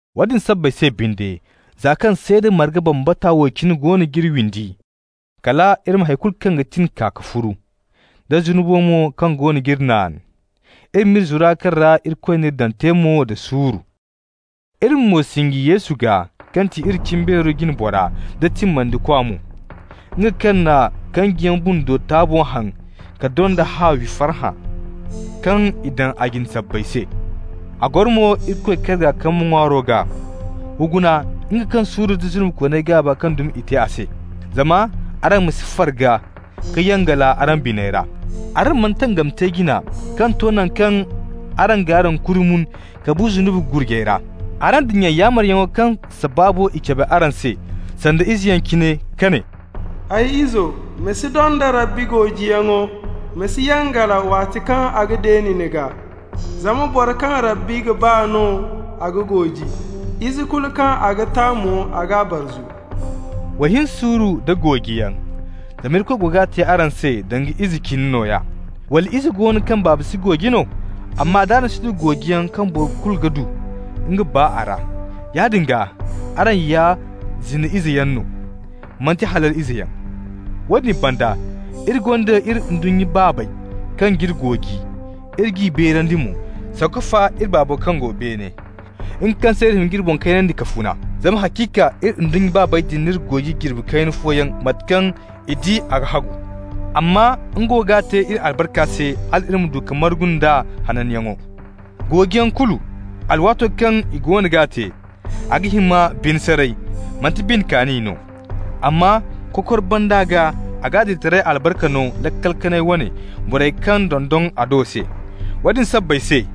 Woodin sabbay se binde, za kaŋ seeda marga bambata wo cine goono g'iri windi, kala iri ma hay kulu kaŋ ga tin kaa ka furu, da zunubo mo kaŋ goono g'iri naan. Iri m'iri zura kaŋ ra Irikoy n'iri daŋ te mo da suuru. Iri ma mo sinji Yesu gaa kaŋ ti iri cimbeero jine bora nd'a timmandikwa mo, nga kaŋ na kanjiyaŋ bundo taabo haŋ ka donda haawi, farhã kaŋ i daŋ a jine sabbay se. A goro mo Irikoy karga kambe ŋwaaro gaa. W'a guna, nga kaŋ suuru nda zunubikooney gaaba kaŋ dumi i te a se, zama araŋ ma si farga ka yangala araŋ biney ra. Araŋ mana tangami te jina ka to naŋ kaŋ araŋ g'araŋ kuuri mun ka bu zunubi gurjay ra. Araŋ dinya yaamaryaŋo kaŋ sabaabo i cabe araŋ se, sanda izeyaŋ cine, kaŋ ne: «Ay izo, ma si donda Rabbi goojiyaŋo, ma si yangala waati kaŋ a ga deeni ni gaa. Zama boro kaŋ Rabbi ga ba no a ga gooji, ize kulu kaŋ a ga ta mo, a g'a barzu.» Wa hin suuru nda goojiyaŋ, zama Irikoy go ga te araŋ se danga ize cine nooya. Wala ize go no kaŋ baaba si gooji no? Amma d'araŋ si du goojiyaŋ, kaŋ boro kulu ga du nga baa a ra, yaadin gaa araŋ ya zina izeyaŋ no, manti halal izeyaŋ. Woodin banda, iri gonda iri ndunnya baabey kaŋ g'iri gooji, iri g'i beerandi mo, sanku fa iri Baabo kaŋ go beene, nga kaŋ se iri ga hima k'iri boŋ kaynandi ka funa. Zama haciika iri ndunnya baabey din n'iri gooji jirbi kayna fooyaŋ mate kaŋ i di a ga hagu. Amma nga wo g'a te iri albarka se, hal iri ma du ka margu nd'a hananyaŋo. Goojiyaŋ kulu, alwaato kaŋ i goono g'a te, a ga hima bine saray, manti bine kaani no. Amma kokor banda gaa a ga adilitaray albarka no, laakal kanay wane, borey kaŋ dondon a do se. Woodin sabbay se,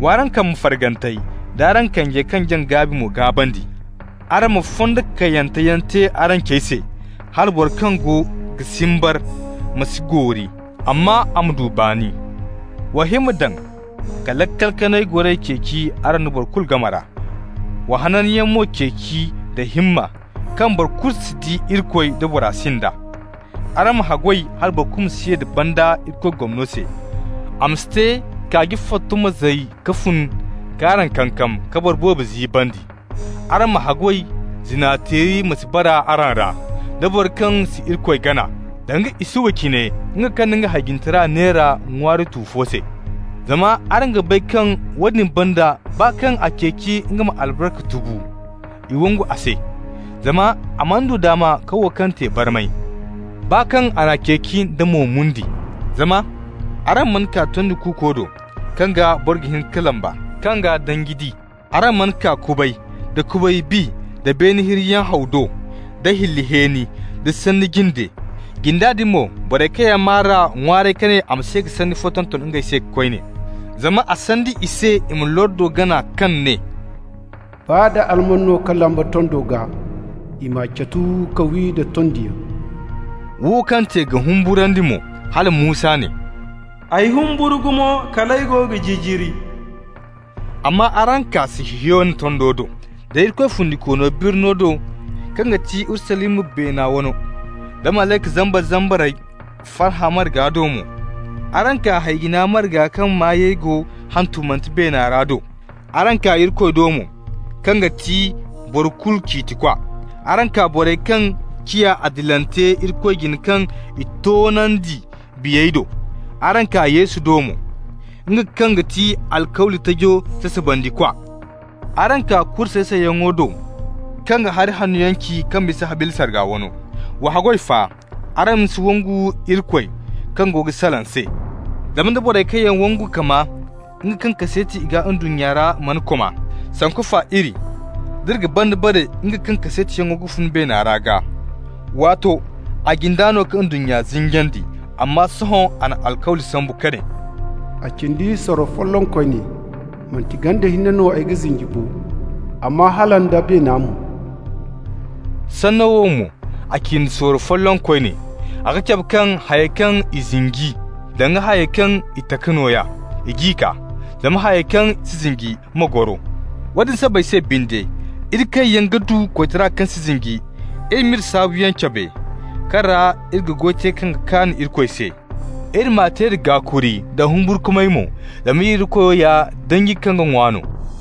w'araŋ kambe fargantey d'araŋ kanjey kaŋ jaŋ gaabi mo gaabandi. Araŋ ma fondo kayyanteyaŋ te araŋ cey se, hala boro kaŋ go ga simbar ma si goori, amma a ma du baani. Wa himma daŋ ka laakal kanay goray ceeci araŋ da boro kulu game ra. Wa hananyaŋ mo ceeci da himma kaŋ boro kulu si di Irikoy da bora sind'a. Araŋ ma haggoy hala boro kulu ma si ye da banda Irikoy gomno se. A ma si te kaaji fotto ma zay ka fun k'araŋ kankam, ka boro boobo ziibandi. Araŋ ma haggoy zina-teeri ma si bara araŋ ra, da boro kaŋ si Irikoy gana, danga Isuwa cine, nga kaŋ na nga hay-jinetara neera ŋwaari tu fo se. Zama araŋ ga bay kaŋ woodin banda baa kaŋ a ceeci nga ma albarka tubu, i wangu a se. Zama a mana du daama ka wo kaŋ te barmay, baa kaŋ a n'a ceeci nda mo-mundi. Zama araŋ mana kaa tondi kuuko do, kaŋ gaa boro ga hin ka lamba, kaŋ gaa danji di. Araŋ mana kaa kubay, da kubay bi, da beene hirriyaŋ haw do, da hilli hẽeni, da sanni jinde. Jinda din mo, borey kaŋ yaŋ maa r'a ŋwaaray ka ne a ma si ye ka sanni fo tonton ngey se koyne. Zama a sandi i se i ma lordo gana kaŋ ne: «Baa da alman no ka lamba tondo gaa, i m'a catu ka wi da tondiyaŋ.» Wo kaŋ te ga humburandi mo, hala Musa ne: «Ay humburu gumo kal ay go ga jijiri.» Amma araŋ kaa Sihiyona tondo do, da Irikoy Fundikoono birno do kaŋ ga ti Urusalima, beena wano, da malayka zambar-zambarey farhã marga do mo. Araŋ kaa hay-jina marga kaŋ maayey go hantumante beena ra do. Araŋ kaa Irikoy do mo, kaŋ ga ti boro kulu ciitikwa. Araŋ kaa borey kaŋ ciya adilante Irikoy jine kaŋ i toonandi biyey do. Araŋ kaa Yesu do mo, nga kaŋ ga ti alkawli tajo sasabandikwa. Araŋ kaa kuri say-sayyaŋo do kaŋ ga hari hannoyaŋ ci kaŋ bisa Habila sarga wano. Wa haggoy fa, araŋ ma si wangu Irikoy kaŋ go ga salaŋ se. Zama nda borey kaŋ yaŋ wangu ka maa nga kaŋ kaseeti i gaa se ndunnya ra mana koma, sanku fa iri, d'iri ga banda bare nga kaŋ kaseetiyaŋo ga fun beena ra gaa. Waato, a jinda no ka ndunnya zinjandi, amma sohõ a na alkawli sambu ka ne: «A cindi sorro folloŋ koyne, manti ganda hinne no ay ga zinji bo, amma hala nda beena mo.» Sanno wo mo: «a cindi sorro folloŋ koyne», a ga cabe kaŋ hayey kaŋ i zinji, danga hayey kaŋ i taka nooya, i g'i kaa, zama hayey kaŋ si zinji ma goro. Woodin sabbay se binde, iri kaŋ yaŋ ga du koytaray kaŋ si zinji, iri ma iri saabuyaŋ cabe, kaŋ ra iri ga goy te kaŋ ga kaan Irikoy se. Iri m'a te da gaakuri nda humburkumay mo. Zama iri Irikoyo ya danji kaŋ ga ŋwa no.